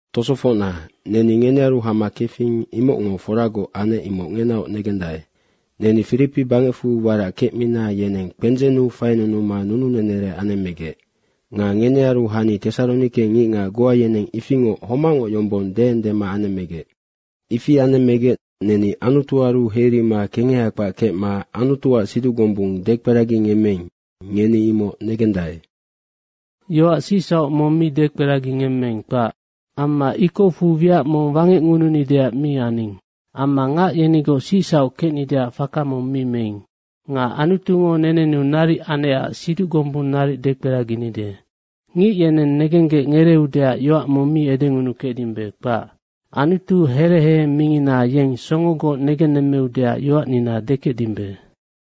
Tosofocna, neni ngenearu hama kefing, imocngo foragoc anec, imoc ngenaoc negendae. Neni Firipi bangecfu warac kecmina yeneng kpendzennu fainunuma nununenere anemmegec. Nga ngenearu hani Tesaronike ngicngac goa yeneng ifingoc homacngoc yombong deendema anemmegec. Ifi anemmegec neni Anutuaru heirima kengeha kpac kecma Anutuac siduc gombung dekperagingemmeing, ngeni imoc negendae. Yoac sicsauc mong mi dekperagingemmeing, kpac. Amma ikocfu wiac mong wangecngununideac mi aning. Amma ngac yenigoc sicsauc kecnideac faka mong mi meing. Nga Anutungo nenenu naric anecac siduc gombung naric dekperaginide. Ngic yeneng negenggec ngereeudeac yoac mong mi edengunukecdimbe, kpac. Anutu here heheng mingina, yeng songogoc negennemmeudeac yoacnina dekecdimbe.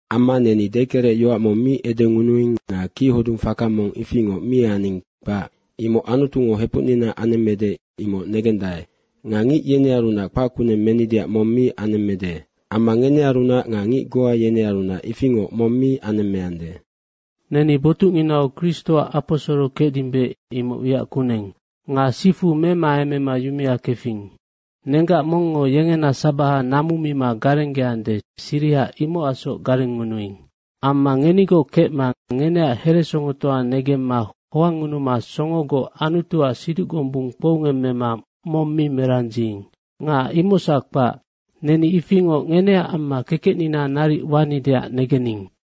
Amma neni dekerecyoac mong mi edengunuing nga kichodung faka mong ifingoc mi aning, kpac. Imoc Anutungo hepucnina anemmede, imoc negendae. Nga ngic yenearunac kpackuneng menideac mong mi anemmede. Amma ngenearunac nga ngic goa yenearunac ifingoc mong mi anemmeande. Neni botucnginau Kristoac aposoro kecdimbe, imoc wiac kuneng. Nga sifu memaemema yumea kefing. Nenggac mongngo yengena sabaha namu mima garenggeande, siriha imocacsoc garengngunuing. Amma ngenigoc kecma ngeneac heresongotoa negemma hoangngunuma songogoc Anutuac siduc gombung kpoungemmema mong mi merandziing. Nga imocsac kpac, neni ifingoc ngeneac amma kekecnina naric wanideac negening.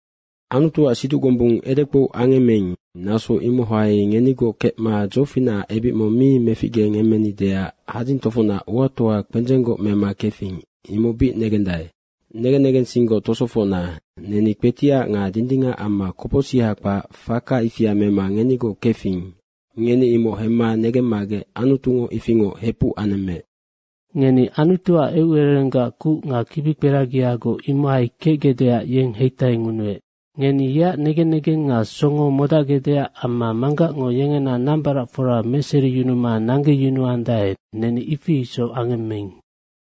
Anutuac siduc gombung edekpou angemmeing, naso imohai ngenigoc kecma dzofinacac ebic mong mi meficgengemmenideac hadzing tofocnac uatoa kpendzenggoc mema kefing, imoc bic negendae. Negen negensinggoc tosofocna, neni kpetiac nga dindingac amma kopocsiha kpac faka ifia mema ngenigoc kefing, ngeni imoc hemma negemmagec Anutungo ifingoc hepuc anemmeec. Ngeni Anutuac eucererenggac kuc nga kibikperagiagoc imohai kecgecdeac yeng heitaingunuec. Ngeni yeac negen negeng nga songo modacgecdeac amma manggacngo yengena nambaracfora meseriyunuma nanggeyunuandae, neni ifi isoc angemmeing.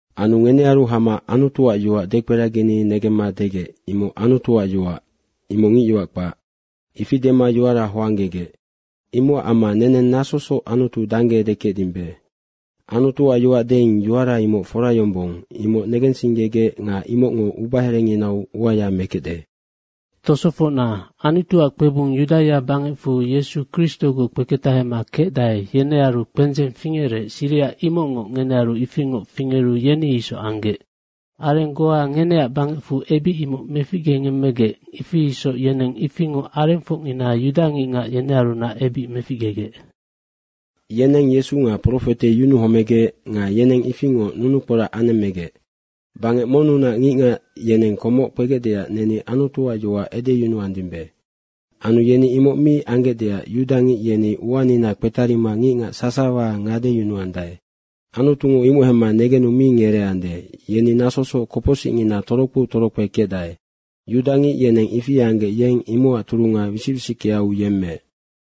Anu ngenearu hama Anutuac yoac dekperagini negemma degec, “Imoc Anutuac yoac, imoc ngicyoac kpac.” Ifi dema yoara hoanggegec. Imocac amma neneng nasosoc Anutu dangge edekecdimbe. Anutuac yoac deing, yoara imoc fora yombong, imoc negensinggegec nga imocngo ubaherenginau uaya mekecde. Tosofocna, Anutuac kpebung Yudaia bangecfu Yesu Kristogoc kpeketahema kecdae, yenearu kpendzeng fingerec, siriha imocngoc ngenearu ifingoc fingeru yeni isoc anggec. Areng goa ngeneac bangecfunac ebic imoc meficgengemmegec. Ifi isoc yeneng ifingoc arengfocngina yudangicngac yenearunac ebic meficgegec. Yenennoc Yesu nga profete yunuhomegec nga yeneng ifingoc nunukporac anemmegec. Bangec monnunac ngicngac yeneng komoc kpegecdeac neni Anutuac yoac edeyunuandimbe. Anu yeni imoc mi anggecdeac yudangic yeni uanina kpetarima ngicngac sasawa ngadeyunuandae. Anutungo imoc hemma negenu mi ngereeande, yeni nasosoc kopocsicngina torokpeu torokpe kecdae. Yudangic yeneng ifi anggec yeng imocac turunga wisic wisickeau yemmeec.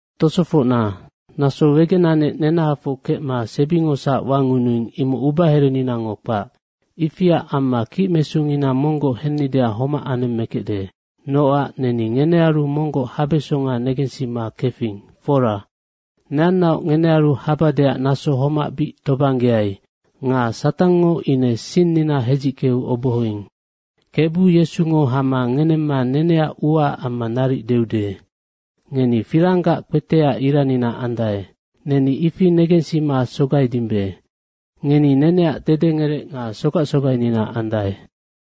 Tosofocna, naso wegenanec nenahafoc kecma sebingosac wangunuing, imoc ubahereninango kpac. Ifiac amma kicmesungina monggoc hennideac homac anemmekecde. Nocac neni ngenearu monggoc habesonga negensima kefing, fora. Neannaoc ngenearu habadeac naso homac bic tobanggeai. — Nga Satangngo ine sinnina hedzickeu obohoing. Kebu Yesungo hama ngenemma neneac uaac amma naric deude. Ngeni firanggac kpeteac iranina andae. Neni ifi negensima sogaidimbe. Ngeni neneac dedengerec nga sogac sogainina andae.